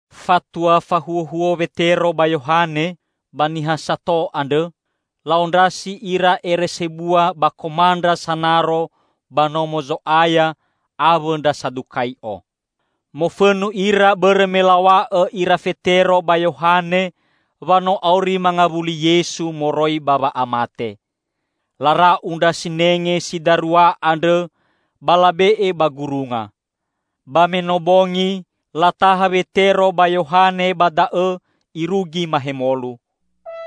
Fatua fahuhuo Wetero ba Yohane ba niha sato andrõ, la'ondrasi ira ere sebua ba komandra sanaro ba Nomo Zo'aya awõ ndra Sadukai'o. Mofõnu ira bõrõ me law̃a'õ ira Fetero ba Yohane wa no auri mangawuli Yesu moroi ba wa'amate. Lara'u ndra sinenge si darua andrõ ba labe'e ba gurunga. Ba me no bongi, lataha Wetero ba Yohane ba da'õ irugi mahemolu.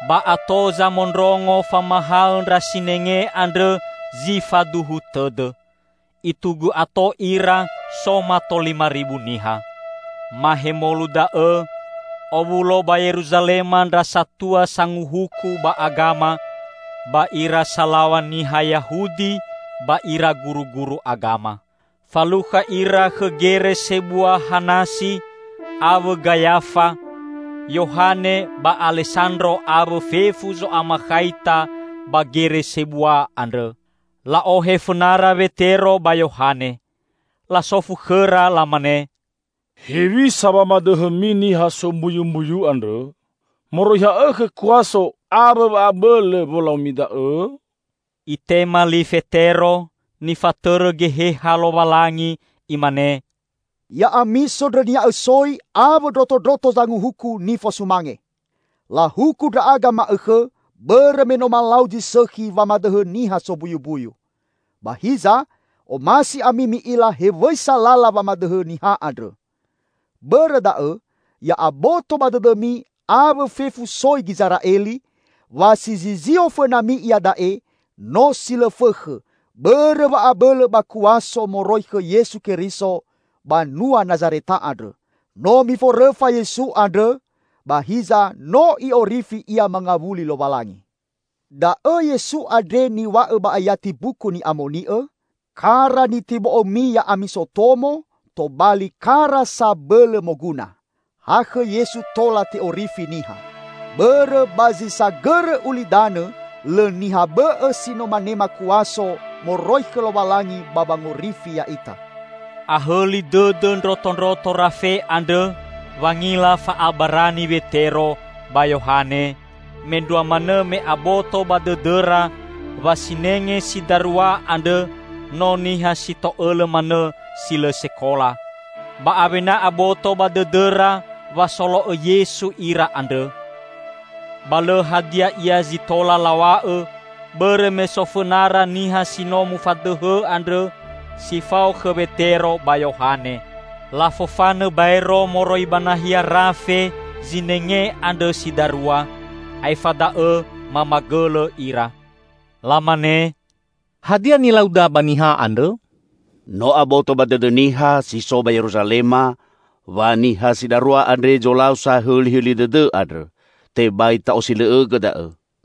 Ba ato zamondrongo famahaõ ndra sinenge andrõ zi faduhu tõdõ. Itugu ato ira so mato lima ribu niha. Mahemolu da'õ owulo ba Yeruzalema ndra satua sanguhuku ba agama, ba ira salaw̃a niha Yahudi ba ira guruguru agama. Falukha ira khõ Gere Sebua Hanasi, awõ Gayafa, Yohane ba Alesandro awõ fefu zo'amakhaita ba gere sebua andrõ. La'ohe fõnara Wetero ba Yohane. Lasofu khõra lamane, "Hewisa wamadõhõmi niha sombuyumbuyu andrõ? Moroi ha'õkhõ kuaso awõ wa'abõlõ wolaumi da'õ?" Itema li Fetero, nifatõrõ Geheha Lowalangi, imane, "Ya'ami sondrõnia'õ soi awõ ndrotondroto zanguhuku nifosumange! Lahuku ndra'aga ma'õkhõ bõrõ me no malau zi sõkhi wamadõhõ niha sombuyumbuyu. Ba hiza, omasi ami mi'ila hewisa lala wamadõhõ niha andrõ. Bõrõ da'õ, ya'aboto ba dõdõmi awõ fefu soi Gizera'eli, wa si zizio fõnami iada'e no si lõ fõkhõ, bõrõ wa'abõlõ ba kuaso moroi khõ Yesu Keriso banua Nazareta andrõ. No miforõfa Yesu andrõ, ba hiza no I'orifi Ia mangawuli Lowalangi. Da'õ Yesu andre niw̃a'õ ba ayati Mbuku Ni'amoni'õ, 'Kara nitibo'õmi ya'ami sotomo, tobali kara sabõlõ moguna.' Ha khõ Yesu tola te'orifi niha. Bõrõ ba zi sagõrõ ulidanõ lõ niha bõ'õ si no manema kuaso moroi khõ Lowalangi ba wangorifi ya'ita." Ahõli dõdõ ndrotondroto rafe andrõ wangila fa'abarani Wetero ba Yohane, mendrua manõ me aboto ba dõdõra wa sinenge si darua andrõ no niha si to'õlõ manõ si lõ sekola. Ba awena aboto ba dõdõra wa solo'õ Yesu ira andrõ. Ba lõ hadia ia zi tola law̃a'õ, bõrõ me so fõnara niha si no mufadõhõ andrõ si fao khõ Wetero ba Yohane. Lafofanõ baero moroi ba nahia rafe zinenge andrõ si darua, aefa da'õ mamagõlõ ira. Lamane, "Hadia nilauda ba niha andrõ? No aboto ba dõdõ niha si so ba Yeruzalema wa niha si darua andre zolau sahõlihõli dõdõ andrõ. Tebai ta'osilõ'õgõ da'õ.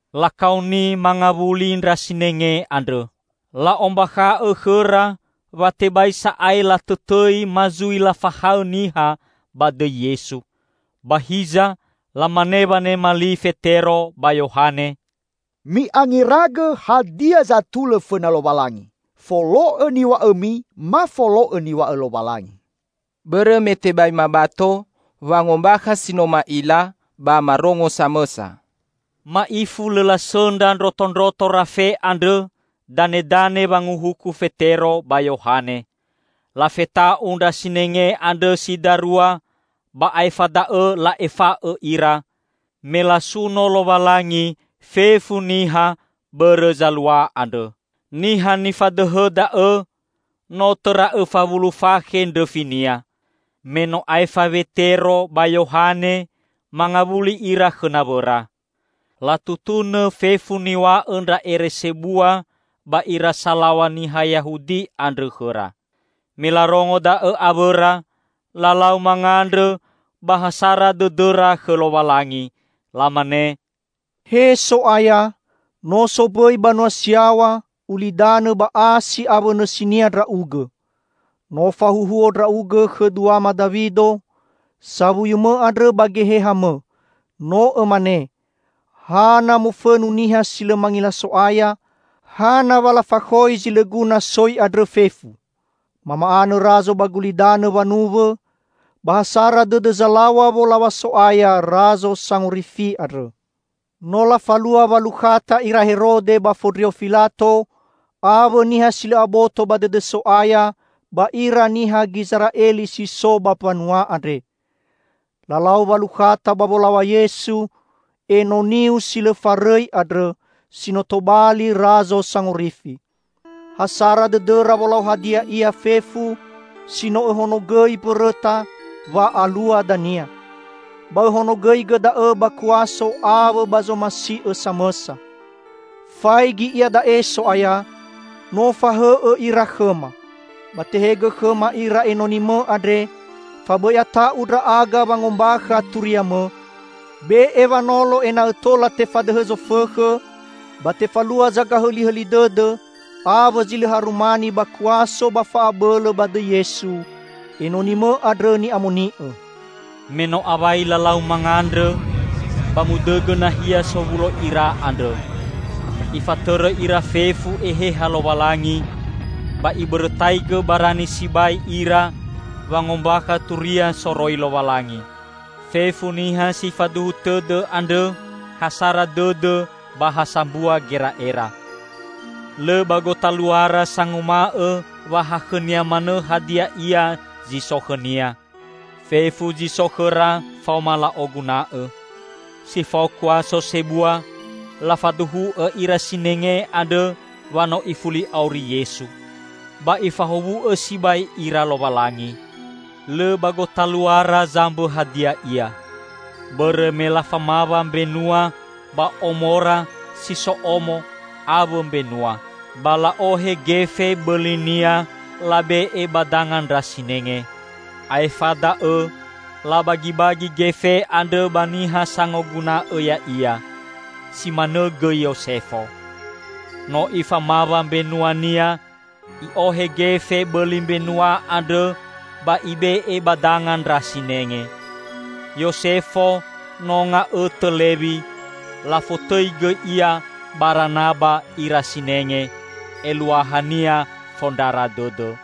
Lakaoni mangawuli ndra sinenge andrõ. La'ombakha'õ khõra wa tebai sa'ae latõtõi ma zui lafahaõ niha ba dõi Yesu. Ba hiza lamane wanema li Fetero ba Yohane, "Mi'angeragõ hadia zatulõ fõna Lowalangi: folo'õ niw̃a'õmi ma folo'õ niw̃a'õ Lowalangi. Bõrõ me tebai mabato wangombakha si no ma'ila ba marongo samõsa." Ma'ifu lõ lasõndra ndrotondroto rafe andrõ danedane wanguhuku Fetero ba Yohane. Lafeta'u ndra sinenge andrõ si darua ba aefa da'õ la'efa'õ ira, me lasuno Lowalangi fefu niha bõrõ zalua andrõ. Niha nifadõhõ da'õ, no tõra õfa wulu fakhe ndrõfinia. Me no aefa Wetero ba Yohane, mangawuli ira khõ nawõra. Latutunõ fefu niw̃a'õ ndra ere sebua ba ira salaw̃a niha Yahudi andrõ khõra. Me larongo da'õ awõra, lalau mangandrõ ba ha sara dõdõra khõ Lowalangi. Lamane, "He So'aya, no sombõi banua si yaw̃a, ulidanõ ba asi awõ nõsinia Ndra'ugõ. No fahuhuo Ndra'ugõ khõ duama Dawido, sawuyu-Mõ andrõ ba Geheha-Mõ; no Õmane, 'Hana mofõnu niha si lõ mangila So'aya; Hana wa lafakhoi zi lõ guna soi andrõ fefu? Mama'anõ razo ba gulidanõ wanuwõ, ba ha sara dõdõ zalaw̃a wolaw̃a So'aya Razo Sangorifi andrõ.' No lafalua walukhata ira Herode ba Fondrio Filato awõ niha si lõ aboto ba dõdõ So'aya ba ira niha Gizera'eli si so ba mbanua andre. Lalau walukhata ba wolaw̃a Yesu, Enoni-U si lõ farõi andrõ, si no tobali Razo Sangorifi. Ha sara dõdõra wolau hadia ia fefu, si no Õhonogõi mbõrõta wa alua dania. Ba Õhonogõigõ da'õ ba kuaso awõ ba zomasi'Õ samõsa. Faigi iada'e So'aya no fahõ'õ ira khõma. Ba tehegõ khõma ira enoni-Mõ andre, fa bõi ata'u ndra'aga wangombakha turia-Mõ. Be'e wanolo ena'õ tola tefadõhõ zofõkhõ ba tefalua zagahõlihõli dõdõ awõ zi lõ harumani ba kuaso ba fa'abõlõ ba dõi Yesu, Enoni-Mõ andrõ ni'amoni'õ." Me no awai lalau mangandrõ, ba mudõgõ nahia sowulo ira andrõ. Ifatõrõ ira fefu Eheha Lowalangi, ba ibõrõtaigõ barani sibai ira wangombakha turia soroi Lowalangi. Fefu niha si faduhu tõdõ andrõ ha sara dõdõ ba ha sambua gera'era. Lõ ba gotaluara sanguma'õ wa ha khõnia manõ hadia ia zi so khõnia. Fefu zi so khõra faoma la'oguna'õ. Si fao kuaso sebua, lafaduhu'õ ira sinenge andrõ wa no ifuli auri Yesu. Ba ifahowu'õ sibai ira Lowalangi. Lõ ba gotaluara zambõ hadia ia. Bõrõ me lafamawa mbenua ba omora si so omo awõ mbenua; ba la'ohe gefe bõlinia labe'e ba danga ndra sinenge. Aefa da'õ labagibagi gefe andrõ ba niha sangoguna'õ ya'ia. Si manõ gõi Yosefo. No ifamawa mbenuania, i'ohe gefe bõli mbenua andrõ ba ibe'e ba danga ndra sinenge. Yosefo no nga'õtõ Lewi; lafotõi gõi ia Baranaba ira sinenge (eluahania Fondrara Dõdõ).